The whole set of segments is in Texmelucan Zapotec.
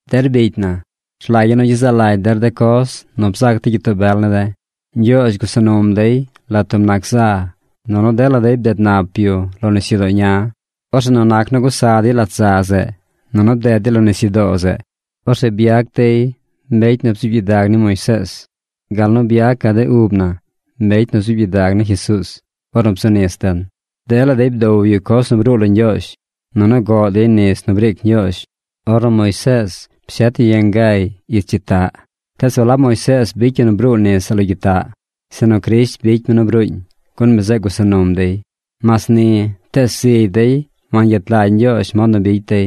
Der bicy na, rlagya̱ nu gyezaꞌ lagy der de coz nu bzac de gyitoo bel ne̱ de̱. Ñgyoozh gusa num dey lat tub nac za, nunu dela dey bded nap yu lo nisyudoo ña. Orzeꞌ nu nac nu gusa dey lat za zeꞌ, nunu bded dey lo nisyudoo zeꞌ, orzeꞌ byac dey mbecy nu bzuub gyidag ni Moisees, gal nu byacaꞌ de ub na mbecy nu zuub gyidag ni Jesuuz ornu bzu nis den. Dela dey bdow yu coz nu bruu lo Ñgyoozh. Nunu goꞌ dey nis nu briic Ñgyoozh ornu Moisees pshet yu yangay ich gyitaꞌ. Tees walab Moisees bicy yu nu bruu nis zeꞌ lo gyitaꞌ, sinu Crisht bicy mi nu bruuñ, gun mi zeꞌ gusa num dey. Mas ni, tees zigy dey wangyet lagy Ñgyoozh mod nu bicy dey.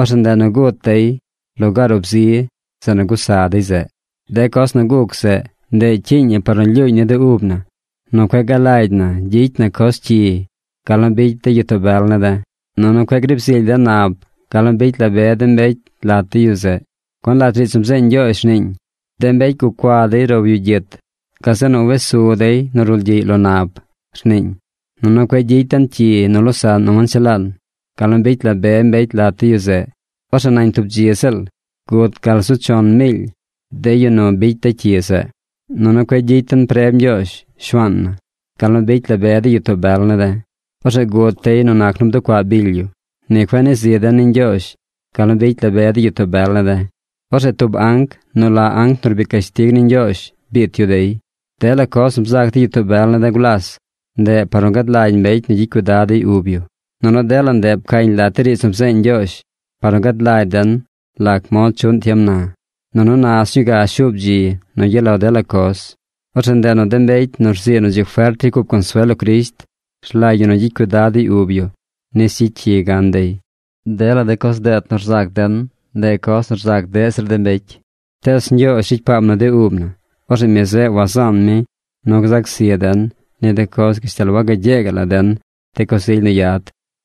Orzeꞌ ndeꞌ nu gut dey lugaar ub zi zeꞌ nu gusa dey zeꞌ. De coz nu guc zeꞌ, ndeꞌ cyiiñ ñi par nu lyuuñ ni de ub na nu cueꞌ galagy na gyicy na coz cyi gal nu bicy de gyitoo bel ne̱ de̱. Nunu cueꞌ griib zily den nab gal nu bicy la be de mbecy lat de yu zeꞌ. Gun lat riidz nu bzeeñ Ñgyoozh rniiñ: “De mbecy gucua dey row yu gyit. Gazeꞌ nu wes su dey nu rulgyiꞌy lo nab”, rniiñ. Nunu cueꞌ gyicy den cyi nu losaꞌn nu wanchelaan gal nu bicy la be mbecy lat de yu zeꞌ. Orzeꞌ nañ tub dzi ziꞌl gut gal zu chon miily de yu nu bicy de cyi zeꞌ. Nunu cueꞌ gyicy den preb Ñgyoozh, Shuaan na, gal nu bicy la be de gyitoo bel ne̱ de̱. Orzeꞌ gut dey nu nac nu bducuaꞌ bily yu. Ni cueꞌ nii zi den ni Ñgyoozh gal nu bicy la be de gyitoo bel ne̱ de̱. Orzeꞌ tub anc nu la Anc nu Rbic Cashtig ni Ñgyoozh biit yu dey. Dela coz nu bzac de gyitoo bel ne̱ de̱ gulas, ndeꞌ par nu gad lagy mbecy nu gyicy cuidad dey ub yu. Nunu dela ndeꞌ pcañ lat de riidz nu bzeeñ Ñgyoozh par nu gad lagy den lac mod chuꞌn tiem na. Nunu na sñuu ga shuub dzi nu gyaꞌ lo dela coz. Orzeꞌ ndeꞌ nu de mbecy nu rzii nu dzi fert ricy cup consuel lo Crisht, rlagy ñi nu gyicy cuidad dey ub yu nis gyicy cyi gan dey. Dela de coz deet nu rzac den, ndeꞌ coz nu rzac deꞌ zir de mbecy. Tees Ñgyoozh ricy paam nu de ub na. Orzeꞌ mi zeꞌ wazaan mi nu gzac zi den ni de coz gashtal wagagyee gaꞌ la den de coz ily nu yad,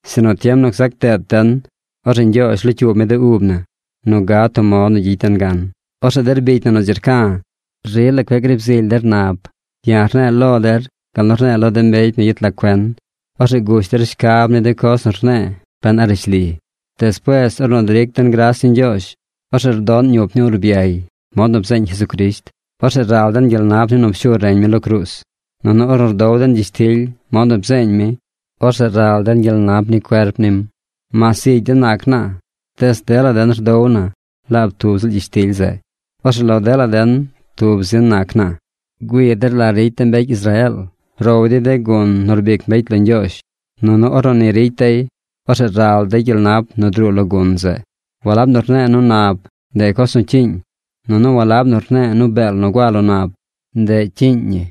sinu tiem nu gzac deet den, orzeꞌ Ñgyoozh locyuub mi de ub na nu gad tub mod nu gyicy den gan. Orzeꞌ der bicya̱ nu dzi rca̱, rila cueꞌ griib zily der nab. Ya̱ rne̱e̱ lo der gal nu rne̱e̱ lo de mbecy nu yet lag cuen. Orzeꞌ gush der shcab ni de coz nu rne̱e̱ ben a rishli. Despuees ornu dric den gras ni Ñgyoozh, orzeꞌ rdoꞌn ñup ni urbyay mod nu bzeeñ Jesucrisht. Orzeꞌ ral den gyel nap ni nu pshu reñ mi lo cruuz. Nunu ornu rdow den gyishtily mod nu bzeeñ mi, orzeꞌ ral den gyel nap ni cuerp nim. Mas zigy den nac naa, tees dela den rdow na laab tub ziꞌl gyishtily zeꞌ. Orzeꞌ lo dela den tub zin nac naa. Güii der la ricy de mbecy Israeel. Row dey de gun nu rbic mbecy lo Ñgyoozh. Nunu ornu ni ricy dey, orzeꞌ ral dey gyel nap nu druu lo gun zeꞌ. Walab nu rne̱e̱ nu nab, ndeꞌ coz nu cyiiñ. Nunu walab nu rne̱e̱ nu beel nu gua lo nab, ndeꞌ cyiiñ ñi.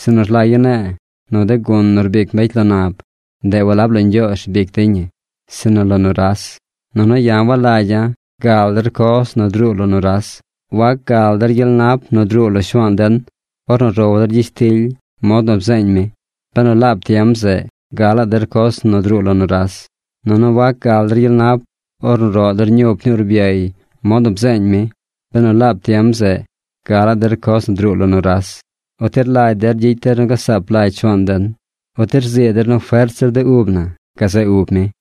Sinu rlagya̱ ne̱e̱ nu de gun nu rbic mbecy lo nab, ndeꞌ walab lo Ñgyoozh rbic dey ñi sinu lo nuras. Nunu ya̱ walagya̱ gal der coz nu druu lo nuras. Wac gal der gyel nap nu druu lo Shuaan den ornu row der gyishtily mod nu bzeeñ mi, benu laab tiem zeꞌ galaꞌ der coz nu druu lo nuras. Nunu wac gal der gyel nap ornu roꞌ der ñup ni urbyay mod nu bzeeñ mi, benu laab tiem zeꞌ galaꞌ der coz nu druu lo nuras. ¿Uti rlagy der gyicy den nu gasaap lagy Shuaan den? ¿Uti rzii der nu fert zir de ub na gazeꞌ ub mi?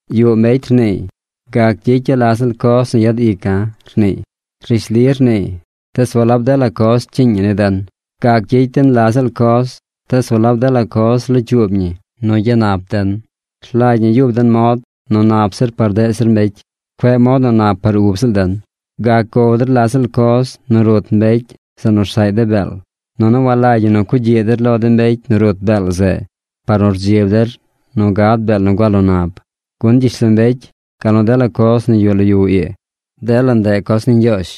Yuꞌ mbecy rniiy: “Gac gyicya̱ la ziꞌl coz nu yad ica̱”, rniiy. Rishli rniiy tees walab dela coz cyiiñ ñi ni den. Gac gyicy den la ziꞌl coz tees walab dela coz locyuub ñi nu gyanap den. Rlagy ñi yub den mod nu nap zir par deꞌ zir mbecy. Cueꞌ mod nu nap par ub ziꞌl den. Gac gow der la ziꞌl coz nu rut mbecy zeꞌ nu rsaꞌy de beel. Nunu walagy ñi nu cugyiꞌ der lo de mbecy nu rut beel zeꞌ par nu rdzib der nu gad beel nu gua lo nab. Gun gyishlombecy, gal nu dela coz nu yuꞌ lo yu ii, dela ndeꞌ coz ni Ñgyoozh.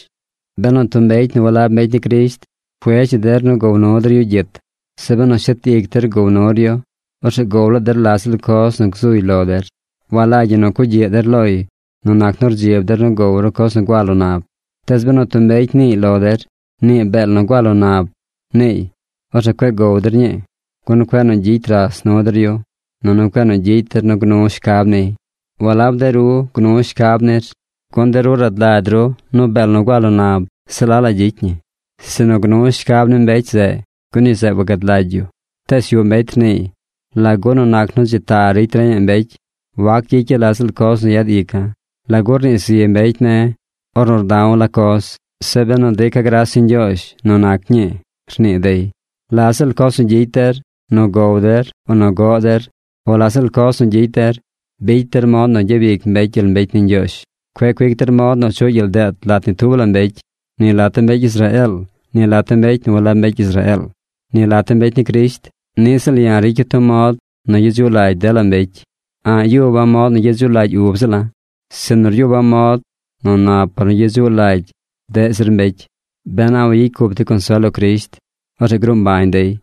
Benu tub mbecy nu walab mbecy ni Crisht cuedz yu der nu gow nu der yu gyit, zeꞌ benu shet ic der gow nur yu, orzeꞌ gow laa der la ziꞌl coz nu gzuy lo der. Walagy ñi nu cugyiꞌ der loy nu nac nu rdzib der nu gow ru coz nu gua lo nab. Tees benu tub mbecy niiy lo der: “Nii beel nu gua lo nab”, niiy, orzeꞌ cueꞌ gow der ñii, gun cueꞌ nu gyicy ras nu der yu, nunu cueꞌ nu gyicy der nu gnu shcab niy. Walab de ru gnu shcab nir, gun de ru rad lagy ru nu beel nu gua lo nab se la la gyicy ñi. Sinu gnu shcab ni mbecy zeꞌ, gun yu zeꞌ wagad lagy yu. Tees yuꞌ mbecy rniiy: “¿Lagu nu nac nu dzi ta ricy reñaꞌ mbecy wac gyicya̱ la ziꞌl coz nu yad ica̱? ¿Lagu rnii zi mbecy ne̱ ornu rda̱w la coz, zeꞌ benu drica̱ gras ni Ñgyoozh nu nac ñii?” rnii dey. La ziꞌl coz nu gyicy der, nu gow der o nu goꞌ der o la ziꞌl coz nu gyicy der, bicy der mod nu gyabic mbecy gyel mbecy ni Ñgyoozh. Cueꞌ cuic der mod nu chuꞌ gyel deet lat ni tub la mbecy: ni lat de mbecy Israeel, ni lat de mbecy nu walab mbecy Israeel, ni lat de mbecy ni Crisht. Niꞌ ziꞌl ya̱ ricya̱ tub mod nu gyedzuꞌ lagy dela mbecy. A̱ꞌ yuba̱ mod nu gyedzuꞌ lagy ub ziꞌla̱, sinu ryuba̱ mod nu nap par nu gyedzuꞌ lagy deꞌ zir mbecy, ben a wayicy cup dey consuel lo Crisht. Orzeꞌ gruu mbañ dey.